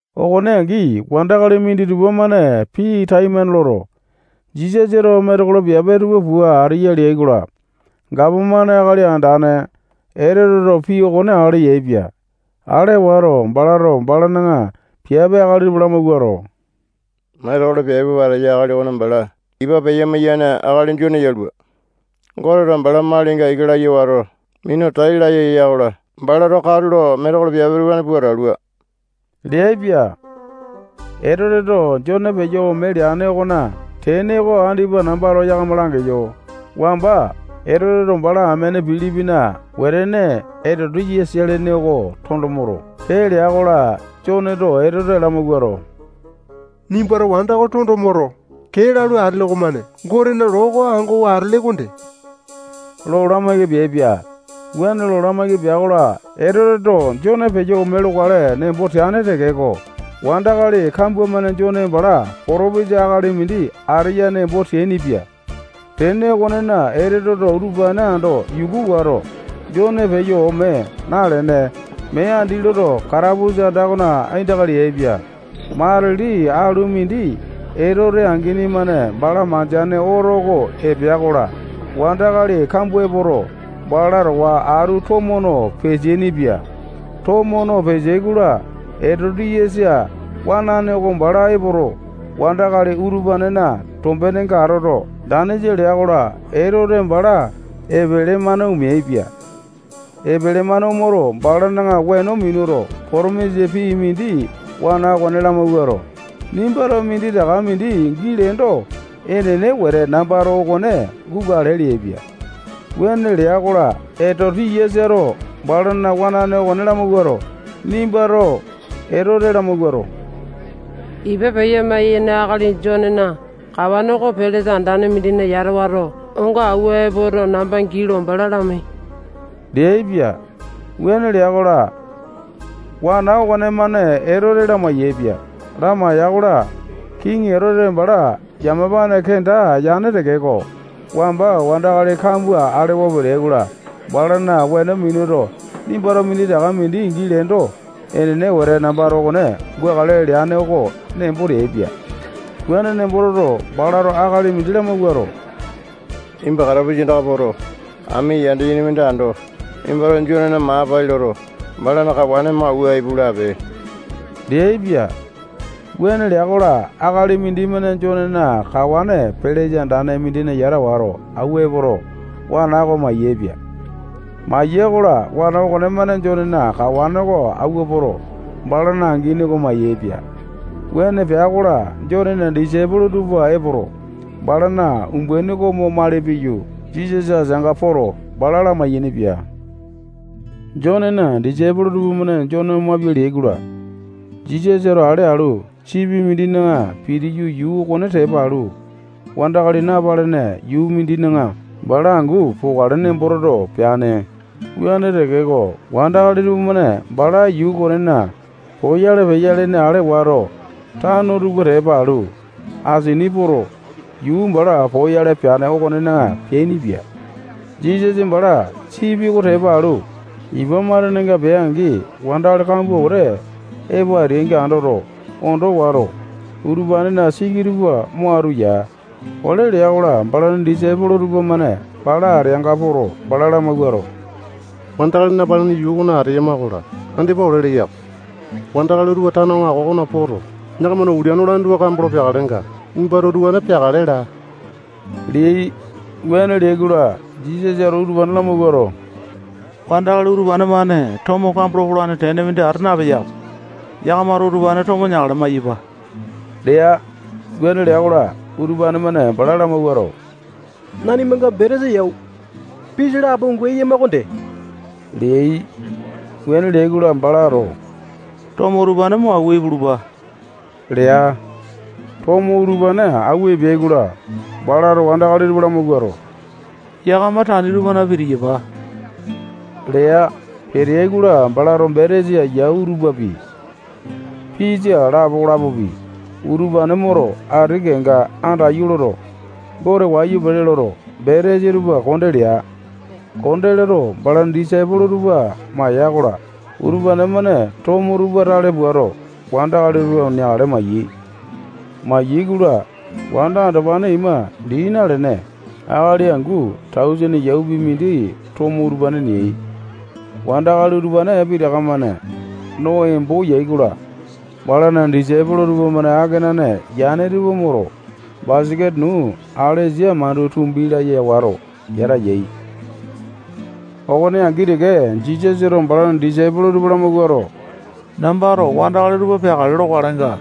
Okone angi, wandakali minditupa-mane pii temane loto, Jisasato metekolo piape tupa pua ateya leai-kola, gapomane akali andane Etoteto pii okone ale yaepia. Ale wato, balato balana piape akali tupa lamawuato, metekolo piape pua ateya akali okone bala ipa peya-maiyane akali Jone yalua. Goteto bala malinga ika laya wato, minu tai laya ya-kola, balato katulo metekolo piape utupane pua atalua leaipia. Etoteto Jone peyo ome leane okona tene oko andipa nambato yakama langeyo. Wamba Etoteto bala amene Pilipina wetene Etoti-yasa lene oko tondo moto, kee lea-kola, Joneto Etote lamawuato, nimbato wanda oko tondo moto, kee lalu atele okomane Gotena loo oko angowa atele okonde lo lamaiki peaipia. Wuane lo lamaiki pea-kola, Etoteto Jone peyo ome lokale nembo teane tekeko, wandakali kambua-mane Jone bala potopesa akali mindi ateya nemboto ateainipia. Tene okonena, Etoteto utupane ando yuku wato, Jone peyo ome nalene, mee andi loto, katapusa anda okona aindaka leaipia. Matili alu mindi Etote angini-mane bala mandeane oto oko epea-kola, wandakali kambua epoto, bala towa atu tomo no peteaini-pia. Tomo no peteai-kola, Etoti-yasa wanane oko bala epoto, wandakali utupanena tombenenga atoto, danisa lea-kola, Etote bala epele-mane omeaipia. Epele-mane omoto, balana weno minuto, potomisa pii mindi wana okone lamawuato, nimbato minditaka mindi gii leendo, enene wete nambato okone gukale leaipia. Wuane lea-kola, Etoti-yasato balana wanane okone lamawuato, nimbato Etote lamawuato, ipa peya-maiyane akali Jonena kawane oko pelesa andane mindina yata wato, onga awua epoto, namba gii lo bala lamai leaipia. Wuane lea-kola, wana okonemane Etote lamai-yaepia. Lamaiya-kola, kiŋi Etote bala yamapane kenda yane tekeko, wamba wandakali kambua alewa peteai-kola, balana weno minuto, nimbato minditaka mindi gii leendo, enene wete nambato okone gukale leane oko nembo teaipia. Wuane nembo toto, balato akali mindi lamawuato, nimba katapusa andaka poto, ami yanda yene mindi ando, nimbato Jonena maa pai loto, balana kawane mo awua ipu lape leaipia. Wuane lea-kola, akali mindimane Jonena kawane pelesa andane mindina yata wato, awua epoto, wana oko mayaepia. Maya-kola, wana okonemane Jonena kawane oko awua poto, balana angini oko mayaepia. Wuane pea-kola, Jonena disaipolo tupa epoto, balana umbaini oko mo mali piyu, Jisasa ateanga poto, bala lamai-yainipia. Jonena disaipolo tupamane Jone omapia leai-kola, Jisasato ale alu, sipi mindina pitiyu, yuu okone tepa alu, wandakali napalene yuu mindina bala angu pokale nembo toto, peane. Wuane tekeko, wandakali tupamane bala yuu okonena poyale peya ale wato, tano tupa tepa alu, asini poto, yuu bala poyale peane okonena peainipia. Jisasa bala sipi oko tepa alu, ipa matenenga pea-angi, wandakali kambua wete epo ateainga andoto, ondo wato, utupanena siki tupa mo atu ya. Ole lea-kola, balana disaipolo tupamane bala ateanga poto, bala lamawuato, wandakali napalene yuu okona ateyama-kola, andipa ole leya-ko. Wandakali utupa tano aŋako tupana poto, yakamana ulia nolane tupa kambolo peakalenga, nimbato utupane peakale laa leai. Wuane leai-kola, Jisasato utupane lamawuato, wandakali utupane-mane tomo kambolo polane tene mindi ata napeya-ko. Yakamato utupane tomo neakale mayapa lea. Wuane lea-kola, utupane-mane bala lamawuato, nanimanga betesa yau, pisa lapo angu eyama okonde leai. Wuane leai-kola, balato tomo utupane mo awua ipulupa lea. Tomo utupane awua epeai-kola, balato wandakali tupa lamawuato, yakama tani tupana pitiyapa lea. Peteai-kola, balato betesa yau tupapi, pisa lapo okolapopi, utupane moto, ati kenga andaiyu loto, Gote wayu pele loto, betesa tupa konde lea. Konde loto, balana disaipolo tupa maya-kola, utupane-mane tomo tupa tale puato, wandakali tupa neakale mayai. Mayai-kola, wanda andopane ima dii nalene, akali angu tausene yaupi mindi tomo utupane neai. Wandakali utupane pitaka-mane no embo yai-kola, balana disaipolo tupamane akenane yane tupa moto, basaketa nuu alesa mandu tumbi laya wato, yata yai. Okone angi teke, Jisasato balana disaipolo tupa lamawuato, nambato wandakali tupa peakale lokalenga,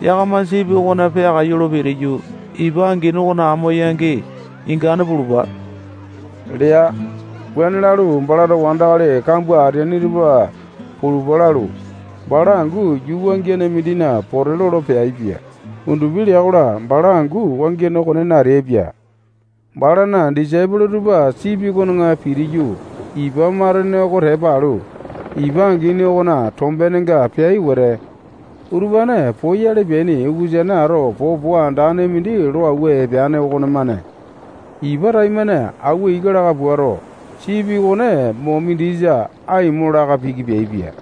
yakama sipi okona peakaiyu lo pitiyu, ipa angini okona amo-yangi ingane pulupa lea. Wuane lalu, balato wandakali kambua ateaini tupa pulupa lalu, bala angu yuu wangiane mindina pote lolo peaipia. Undupi lea-kola, bala angu wangiane okonena ateaipia. Balana disaipolo tupa sipi okona pitiyu, ipa matene oko tepa alu, ipa angini okona tombenenga peai wete, utupane poyale peaini ukusane ato popo andane mindi lo awua epeane okonemane ipa taimane awua ika laka puato, sipi okone mo mindisa aimo laka piki peaipia.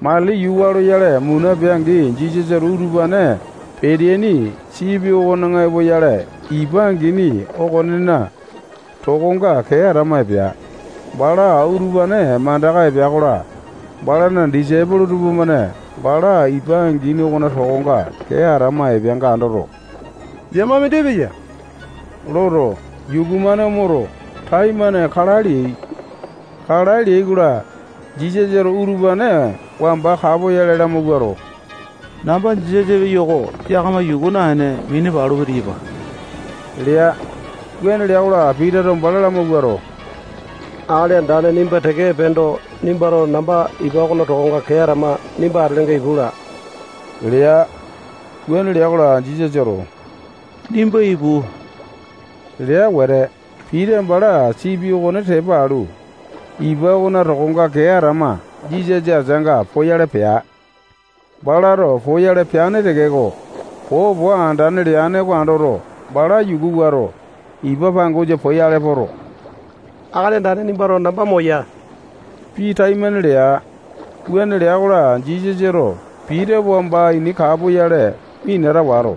Matili yuu waa loyale muna pea-angi, Jisasato utupane peteaini sipi okona epoyale, ipa angini okonena tokonga kee atama epea. Bala utupane mandaka epea-kola, balana disaipolo tupamane bala ipa angini okona tokonga kee atama epeanga andoto, yama mindi epeya loto, yuku-mane omoto, taimane kalae leai. Kalae leai-kola, Jisasato utupane wamba kapoyale lamawuato, namba Jisasa epeyo-ko. Yakama yuku naene, mini palu pitiyapa lea. Wuane lea-kola, Pitato bala lamawuato, Akali Andane nimba teke epeendo, nimbato namba ipa okona tokonga kee atama nimba atelenga ipu laa lea. Wuane lea-kola, Jisasato nimba ipu lea wete, Pita bala sipi okone tepa alu, ipa okona tokonga kee atama Jisasa ateanga poyale pea. Balato poyale peane tekeko, popo andane leane oko andoto, bala yuku wato, ipa pangosa poyale poto, Akali Andane nimbato namba moya pii taimane lea. Wuane lea-kola, Jisasato Pita wamba ini kapoyale minata wato,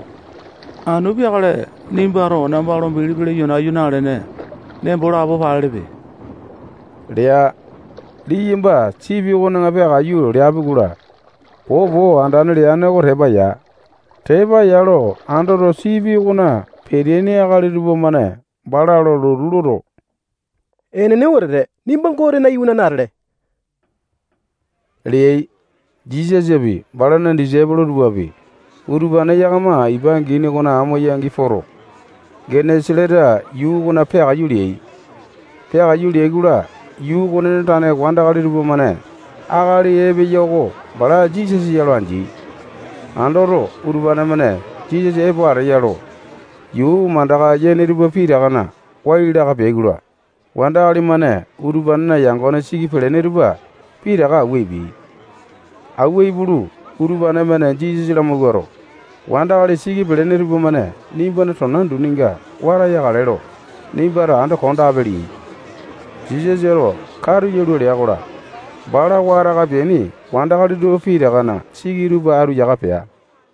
anu peakale nimbato namba lo bilipi leyo nayu nalene, nembo lapo palelepe lea. Liyamba sipi okona peakaiyu leapi-kola, popo andane leane oko tepa ya. Tepa ya lo andoto, sipi okona peteaini akali tupamane bala lo lotu loto, enene wetete, nimba Gotena iwanane atele leai. Jisasapi, balana disaipolo tupapi, utupane yakama ipa angini okona amo-yangi poto, Genesa-leta yuu okona peakaiyu leai. Peakaiyu leai-kola, yuu okonena tane wandakali tupamane akali epeya oko bala Jisasa ya lo andeai. Andoto, Utupane-mane Jisasa epo ateya lo yuu mandaka yane tupa pitakana wai laka peai-kola, wandakali-mane utupanena yangone siki pelene tupa pitaka awua epeai. Awua ipulu, utupane-mane Jisasa lamawuato, wandakali siki pelene tupamane nimbana tona duninga wata yakale lo nimbato ando kondape leai. Jisasato katu yalua lea-kola, bala wataka peaini wandakali tupa pitakana siki tupa atu yaka pea.